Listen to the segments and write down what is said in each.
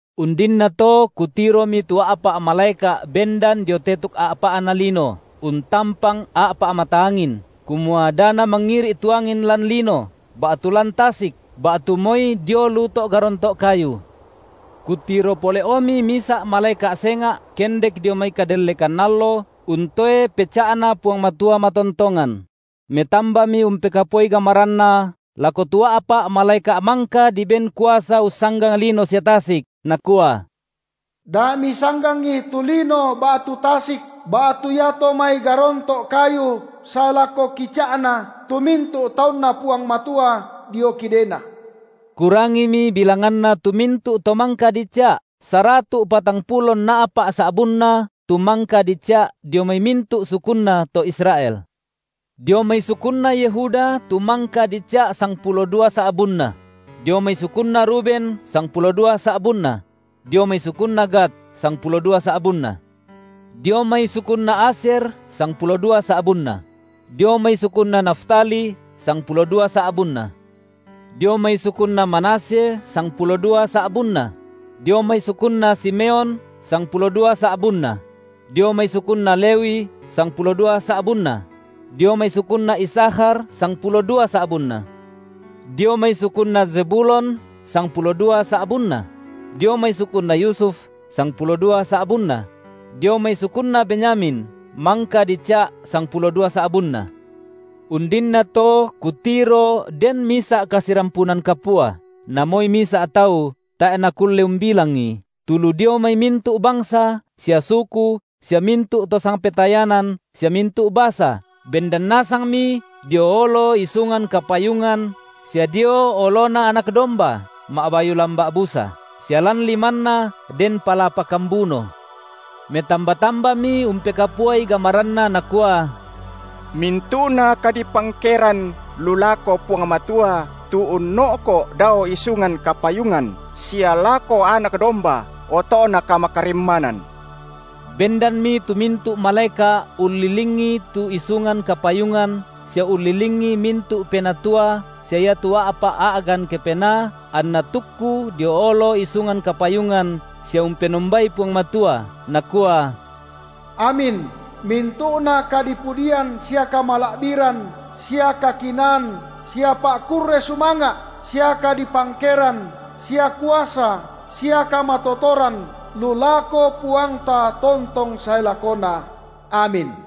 Undinnato kutiromi tu a’pa’ malaeka’ bendan dio tetuk a’pa’na lino, untampang a’pa’ mata angin, kumua da namangiri’ tu angin lan lino ba’tu lan tasik ba’tu moi dio lu to’ garonto’ kayu. Kutiro pole’omi misa’ malaeka’ senga’ kendek dio mai kadellekan allo untoe peca’Na Puang Matua matontongan; metambami umpekapuai gamaranna lako tu a’pa’ malaeka’ mangka diben kuasa ussanggang lino sia tasik, nakua: Da misanggangi tu lino ba’tu tasik ba’tu iato mai garonto’ kayu sae lako kica’na tu mintu’ taunNa Puang Matua dio kidena. Kurangimi bilanganna tu mintu’ to mangka dica’ saratu’ patangpulo nna’pa’ sa’bunna tu mangka dica’ dio mai mintu’ sukunna to Israel: dio mai sukunna Yehuda tu mangka dica’ sangpulo dua sa’bunna; dio mai sukunna Ruben sangpulo dua sa’bunna; dio mai sukunna Gad sangpulo dua sa’bunna; dio mai sukunna Asyer sangpulo dua sa’bunna; dio mai sukunna Naftali sangpulo dua sa’bunna; dio mai sukunna Manasye sangpulo dua sa’bunna; dio mai sukunna Simeon sangpulo dua sa’bunna; dio mai sukunna Lewi sangpulo dua sa’bunna; dio mai sukunna Isakhar sangpulo dua sa’bunna; dio mai sukunna Zebulon sangpulo dua sa’bunna; dio mai sukunna Yusuf sangpulo dua sa’bunna; dio mai sukunna Benyamin mangka dica’ sangpulo dua sa’bunna. Undinnato kutiro den misa’ kasirampunan kapua, na moi misa’ tau tae’ nakulle umbilangi, tu lu dio mai mintu’ bangsa sia suku sia mintu’ to sangpetayanan sia mintu’ basa, bendan nasangmi dio olo isungan kapayungan sia dio oloNa Anak domba, ma’bayu lamba’ busa, sia lan limanna den palapa kambuno; metamba-tambami umpekapuai gamaranna nakua: Mintu’na kadipangkeran lu lako Puang Matua tu unno’ko’ dao isungan kapayungan, sia lako Anak domba, oto’na kamakarimmanan. Bendanmi tu mintu’ malaeka’ ullilingi tu isungan kapayungan sia ullilingi mintu’ penatua sia iatu a’pa’ a’gan kepenaa, anna tukku dio olo isungan kapayungan sia umpenombai Puang Matua, nakua: Amin, mintu’na kadipudian sia kamala’biran sia kakinaan sia pa’kurre sumanga’ sia kadipangkeran sia kuasa sia kamatotoran lu lako Puangta tontong sae lakona! Amin.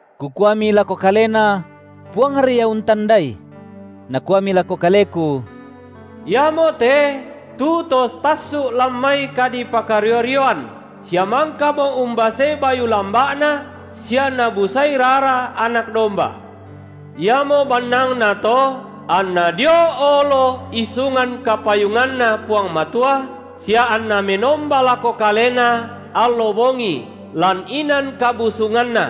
Kukuami lako kalena: Puangri ia untandai. Nakuami lako kaleku: Iamote tu to tassu’ lan mai kadipakario-rioan sia mangkamo umbasei bayu lamba’na sia nabusai rara Anak domba. Iamo bannangna to anna dio olo isungan kapayunganNa Puang Matua, sia anna menomba lako Kalena allo bongi lan inan kabusunganNa;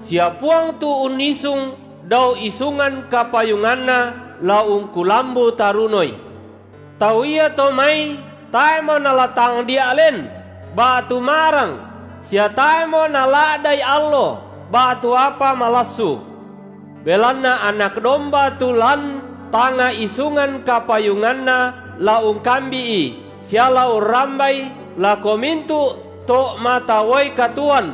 sia Puang tu unnisung dao isungan kapayunganNa la ungkulambu tarunoi. Tau iato mai tae’mo nala tangdia’ len ba’tu ma’rang sia tae’mo nala’da’i allo ba’tu apa malassu: belanna Anak domba tu lan tangnga isungan kapayunganNa la ungkambi’i sia la urrambai lako mintu’ to’ mata uai katuoan;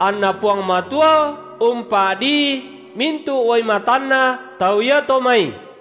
anNa Puang Matua umpa’dii mintu’ uai matanna tau iato mai.